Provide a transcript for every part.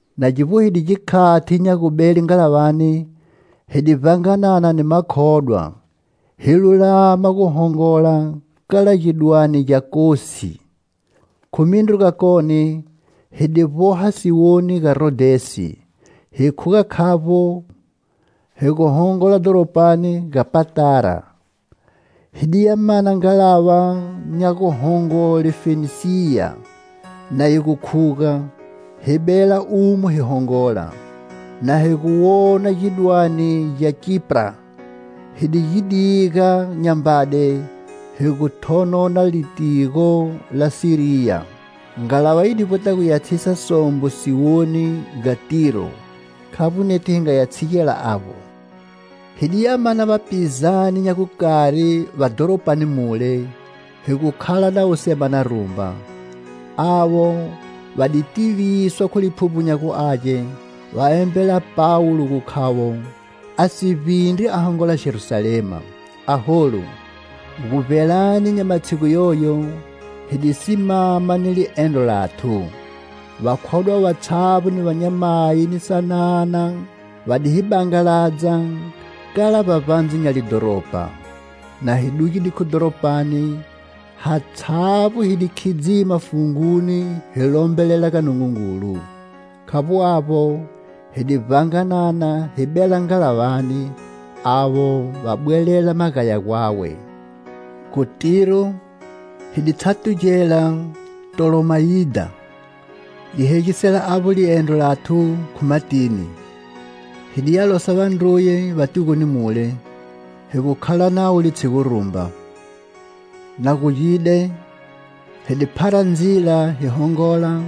Na gi vbohide gikhati nya gubele ngalavani, hi di vbanganana ni makhodwa, hi lulama gu hongola kala gidwane gya Kosi. Khu mindru gakone hi di vboha siwoni ga Rodhesi, hi khuga khavbo hi gu hongola dhoropani ga Patara. Hi di ya mana ngalava nya guhongole Fenisiya na yi gu khuga, hi bela umo hi hongola. Na hi gu wona gidwane gya Kipra, hi di gi diga nyambade hi gu thonona litigo la Siriya. Ngalava yi di vbweta gu ya tshisa sombo siwoni ga Tiro, khavbo nethu hi nga ya tshigela avbo. Hi di ya mana vapizane nya gukari va dhoropani mule, hi gu khala navo semana rumba. Avo va di tiviswa khu Liphuvbo nya gu Age, va embela Pawulo gu khavo a si vbindri a hongola Jerusalema. Aholu, gu vbelani nya matshigu yoyo, hi di simama ni liendro lathu. Vakhodwa vatshavbo ni vanyamayi ni sanana va di hi bangaladza kala vbavbandze nya lidhoropa. Na hi dugide khu dhoropani, hatshavbo hi di khidzima funguni hi lombelela ga Nungungulu. Khavbo avbo, hi di vbanganana hi bela ngalavani, avo va bwelela magaya gwawe. Khu Tiro hi di tshatugela Ptolomayidha, li hegisela avba liendro lathu khu matini. Hi diya losa vandruye va tigoni mule, hi gu khala navo litshigu rumba. Na gugide, hi di phara ndzila hi hongola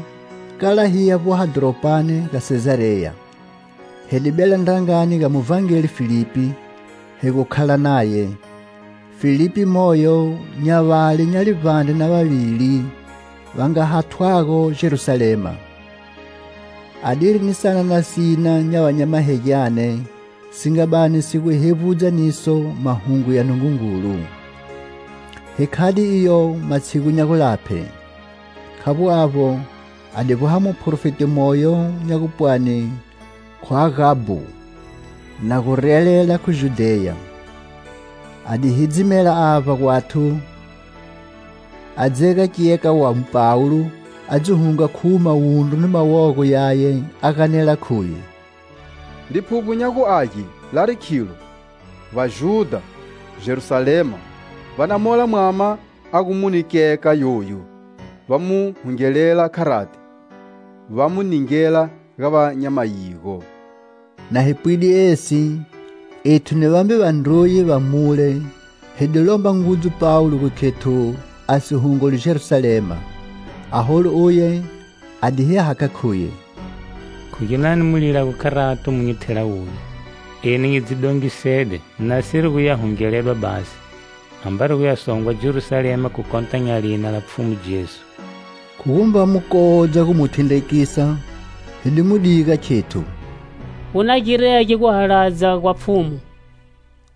kala hi ya vboha dhoropani ga Sezareya. Hi di bela ndrangani ga muvhangeli Filipi, hi gu khala naye. Filipi moyo nya vale nya livbandre na vavili va nga hathwago Jerusalema. Adiri ni sanana sina nya vanyamahegyane si nga bani si gu hevbudza niso Mahungu ya Nungungulu. Hi khade iyo matshigu nya gulaphe. Khavbo avbo a di vboha muprofeti moyo nya gupwani khu Agabo, na gu relela khu Judheya. A di hidzimela avba gwathu, a dzega kyeka wa Pawulo a dzi hunga khuwo mawundru ni mawogo yaye, a ganela khuye: "Liphuvbo nya gu Age lari khilo, Vajudha, Jerusalema, va na mola mwama a gu mune kyeka yoyu, va mu hungelela kharati, va mu ningela ga va nya mayigo." Na hi pwide esi, ethu ni vambe vandruye va mule hi di lomba ngudzu Pawulo gu khethu a si hongoli Jerusalema. Aholu uye a di hi hakha khuye: "Khu ginani mu lilago kharato mu nyi thela wuvi? Eni nyi dzi dongisede, nasiri gu ya hungeledwa basi, ambari gu ya songwa Jerusalema khu kota nya lina la Pfhumu Jesu." Khu gumba mu kodza gu mu thindregisa, hi di mu diga khethu: "Gu na girege guhaladza gwa Pfhumu!"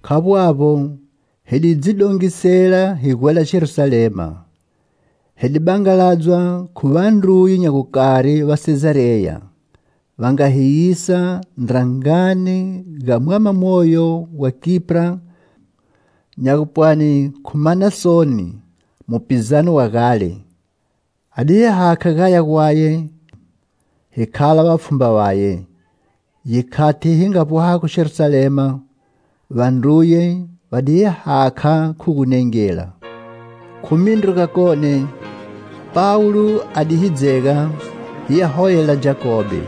Khavbo avbo, hi di dzi dongisela hi gwela Jerusalema. Hi di bangaladzwa khu vandruye nya gukari va Sezareya, va nga hi yisa ndrangani ga mwama moyo wa Kipra nya gu pwani khu Manasoni, mupizane wa gale. A di hi hakha gaya gwaye, hi khala vapfhumba vaye. Gikhati hi nga vbohago Jerusalema, vandruye va di hi hakha khu gunengela. Khu mindru gakone, Pawulo a di hi dzega hi ya holela Jakobe.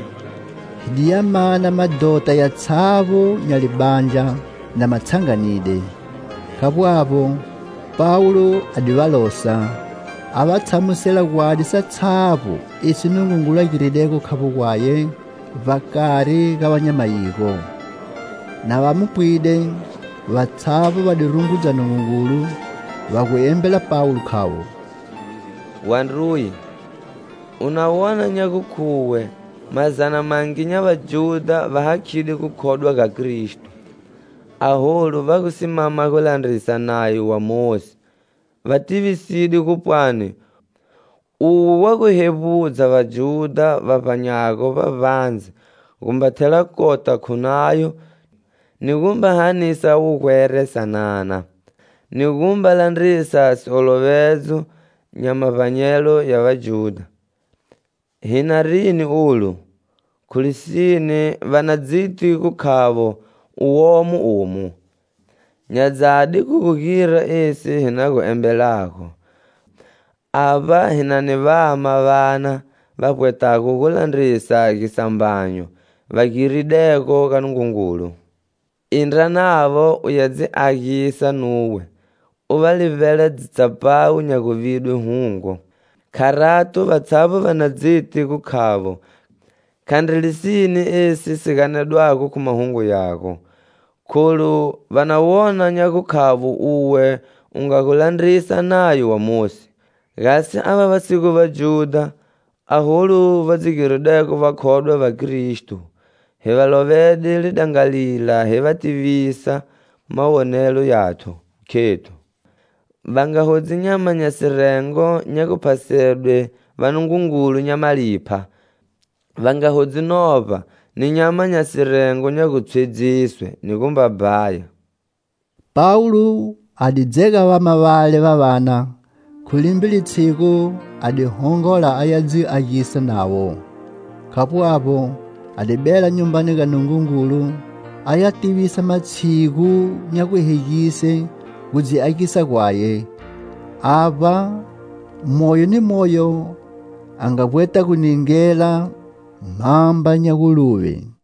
Hi di ya mana madhota yatshavbo nya libandla na ma tshanganide. Khavbo avbo, Pawulo a di va losa, a va tshamusela gwadi satshavbo esi Nungungulu a giridego khavbo gwaye vbakari ga va nya mayigo. Na va mu pwide, vatshavbo va di rungudza Nungungulu, va gu embela Pawulo khavo: "Wandruye, u na wona nya gukhuwe mazana mangi nya Vajudha va hakhide gukhodwa ga Kristo, aholu va gu simama gu landrisa Nayo wa Mosi. Va tivisidwe gu pwani uwe wa gu hevbudza Vajudha va vbanyago vbavbandze gu mba thela kota khu Nayo ni gu mba hanisa wugwera sanana, ni gu mba landrisa siolovedzo nya mavbanyelo ya Vajudha. Hi na rini olu? Khu lisine, va na dziti gu khavo u womo omu. Nya dzadi khu gu gira esi hi na gu embelago: avba hi na ni vama vana va vbwetago gu landrisa gisambanyo va giridego ga Nungungulu. Indra navo, u ya dzi agisa nuwe, u va livbela dzitsapawu nya guvidwe hungo. Kharato, vatshavbo va na dziti gu khavo khandri lisine esi si ganedwago khu mahungu yago, kholu va na wona nya gukhavo uwe u nga gu landrisa Nayo wa Mosi. Gasi, ava va si gu Vajudha aholu va dzi giridego vakhodwa va Kristo, hi va lovede lidangalila hi va tivisa mawonelo yathu, khethu: va nga hodzi nyama nya sirengo nya guphasedwe vanungungulu nya malipha, va nga hodzi novba, ni nyama nya sirengo nya gutshwedziswe, ni gumba bhaya." Pawulo a di dzega vama vale va vana, khu limbe litshigu a di hongola aya dzi agisa navo. Khavbo avbo, a di bela Nyumbani ga Nungungulu a ya tivisa matshigu nya guhegise gu dzi agisa gwawe, avba moyo ni moyo a nga vbweta gu ningela mhamba nya guluve.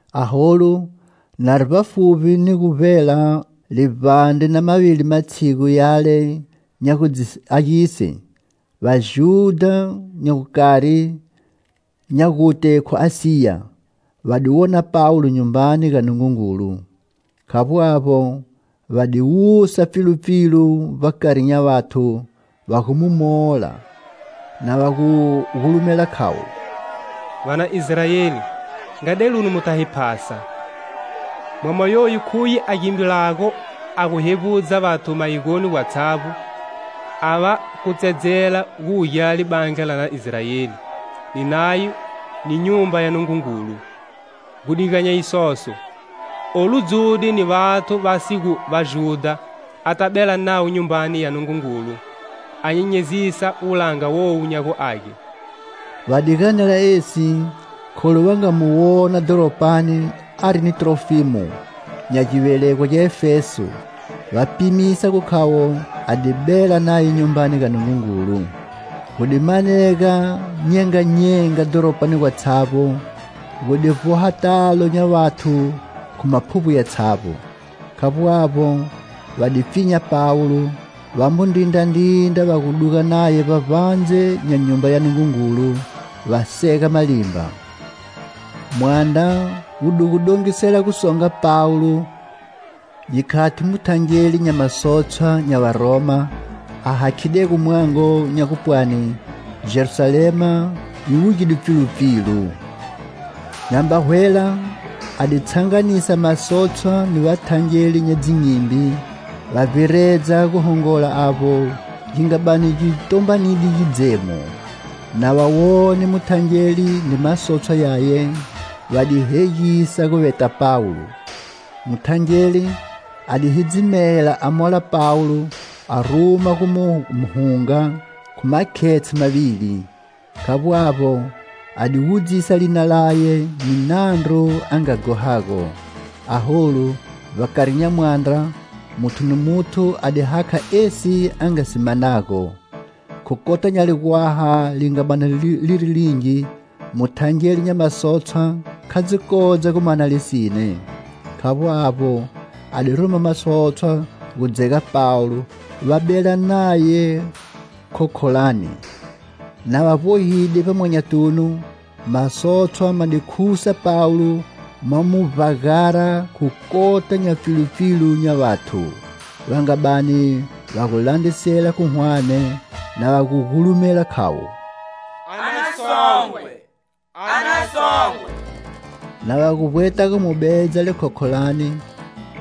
Aholu, mari vbafuvbi ni gu vbela livbandre na mavili matshigu yale nya gu dzi agise, Vajudha nya gukari nya gute khu Asiya va di wona Pawulo Nyumbani ga Nungungulu. Khavbo avbo, va di wusa pfilupfilu vbakari nya vathu, va gu mu mola, na va gu gulumela khavo: "Va na Israeli, nga deluni mu ta hi phasa! Mwama yoyu khuye a gimbilago a gu hevbudza vathu mayigoni gwatshavbo, a va kutsedzela gu wugela libandla lana Israeli, ni Nayo ni Nyumba ya Nungungulu. Gu diga nya isoso, olu dzude ni vathu va si gu Vajudha ata bela navo Nyumbani ya Nungungulu, a nyenyezisa wulanga wowu nya gu age!" Va di ganela esi kholu va nga mu wona dhoropani ari ni Trofimo, nya givelegwa gya Efeso, va pimisa gu khavo a di bela naye Nyumbani ga Nungungulu. Gu di manega nyenganyenga dhoropani gwatshavbo, gu di vboha talo nya vathu khu maphuvbo yatshavbo. Khavbo avbo, va di pfinya Pawulo, va mu ndrindrandrindra va gu duga naye vbavbandze nya Nyumba ya Nungungulu, va sega malimba. Mwandra wu di gu dongisela gu songa Pawulo gikhati muthangeli nya masotshwa nya Varoma a hakhidego mwango nya gu pwani Jerusalema yi wugide pfilupfilu. Nyamba hwela a di tshanganisa masotshwa ni vathangeli nya dzinyimbi va vbiredza gu hongola avbo gi nga bani gi tombanide gidzemo. Na va wone muthangeli ni masotshwa yaye, va di hegisa gu veta Pawulo. Muthangeli a di hidzimela a mola Pawulo a ruma gu mu hunga khu makhetshe mavili. Khavbo avbo, a di wudzisa lina laye ni nandru a nga ghohago. Aholu, vbakari nya mwandra, muthu ni muthu a di hakha esi a nga si manago. Khu kota nya ligwaha li nga bani liri lingi, muthangeli nya masotshwa kha dzikodza gu mana lisine. Khavbo avbo, a di ruma masotshwa gu dzega Pawulo va bela naye khokholani. Na va vbohide vbamwanyatunu, masotshwa ma di khusa Pawulo ma mu vbagara khu kota nya pfilupfilu nya vathu, va nga bani va gu landrisela khu hwane, na va gu gulumela khavo: "A na songwe! A na songwe!" Na va gu vbweta gu mu bedza likhokholani,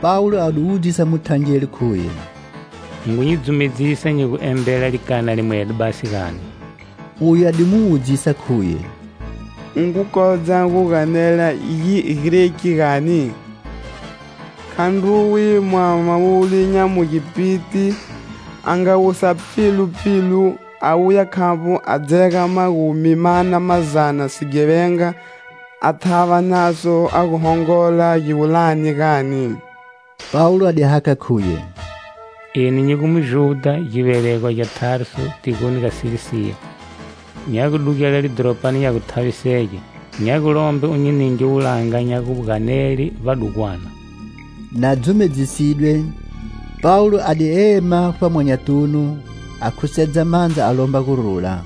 Pawulo a di wudzisa muthangeli khuye: "U ngu nyi dzumedzisa nyi gu embela likana limwedo basi, gani?" Uye a di mu wudzisa khuye: "U ngu kodza gu ganela Gigreki gani? Khandruwe mwama wule nya Mugipiti a nga wusa pfilupfilu a wuya khavbo a dzega magumi mana mazana sighevenga a thava naso a gu hongola giwulani, gani?" Pawulo a di hakha khuye: "Eni nyi Mujudha, givelegwa gya Tarsu tigoni ga Silisiya. Nya gu dugela lidhoropani nya gu thavisege. Nya gu lomba u nyi ninge wulanga nya gu ganele vbadugwana" Na dzumedzisidwe, Pawulo a di ema khu vbamwanyatunu, a khusedza mandza a lomba gurula.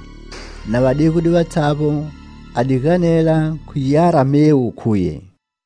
Na va degude vatshavbo, a di ganela khu Giaramewu khuye: